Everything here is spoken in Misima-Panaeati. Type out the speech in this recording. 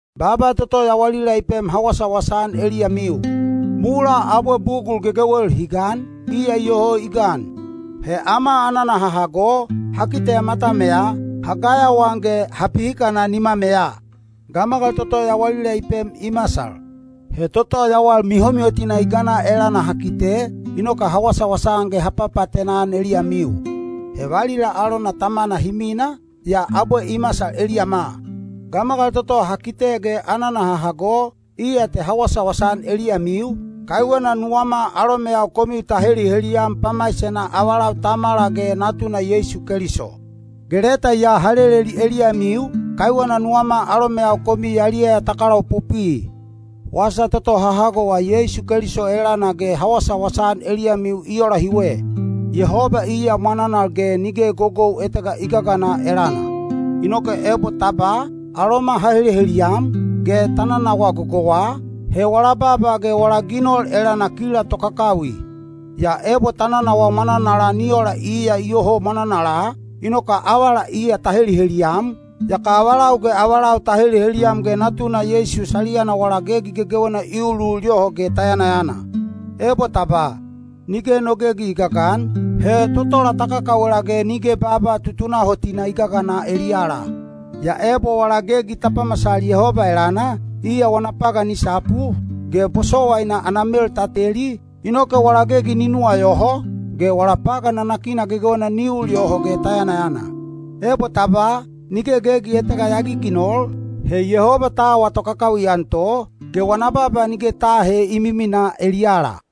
Baaba toto yawalila i pem ha wasawasa-an eliyamiu. Mulaa abwe bugul gegewel hi gan, iya iyoho i gan. He ama anana ha hago, ha kiteya matameya, ha gayawaan ge ha pihikana nimameya. Gamagal toto yawalila i pem i masal. He toto yawal mihomihotina i gana elana ha kite, inoke ha wasawasa-an ge ha papaatena-an eliyamiu. He valila alona Tamana hi mina, yaa abwe i masal eliyama. Gamagal toto ha kite ge anana ha hago, iya te ha wasawasa-an eliyamiu, kaiwena nuwama alomeyau komiu ta heliheliyam pamaisena avalau Tamala ge Natuna Yeisu Keliso. Ge leta ya ha leleli eliyamiu, kaiwena nuwama alomeyau komiu yaliyaya ta kalaopopwi. Wasa toto ha hagowa Yeisu Keliso elana ge ha wasawasa-an eliyamiu i ola hiwe: Yehoba iya mwananal ge nige gogou etega i gagana elana. Inoke ebo ta ba, “Aloma ha heliheliyam,” ge ta nanawaa gogouwa, he wala baaba ge wala ginol elana kila tokakawi. Yaa ebo ta nanawaa mwananala ni ola iya iyoho mwananala, inoke avala iya ta heliheliyam, yaka avalau ge avalau ta heliheliyam ge Natuna Yeisu saliyana wala gegi gegewena i ulul yoho ge ta yanayana. Ebo ta ba, “Nige no gegi i gagan,” he totola ta kakawela ge nige baaba tutunahotina i gagana eliyala. Yaa ebo wala gegi ta pamasal Yehoba elana, iya wana pagan i sapu, ge bosowaina ana mel ta teli, inoke wala gegi ni nuwayoho, ge wala pagan nanakina gegewena ni ul yoho ge ta yanayana. Ebo ta ba, “Nige gegi etega ya giginol,” he Yehoba ta awa tokakawi-an to, ge wana baaba nige ta aahe i miminaa eliyala.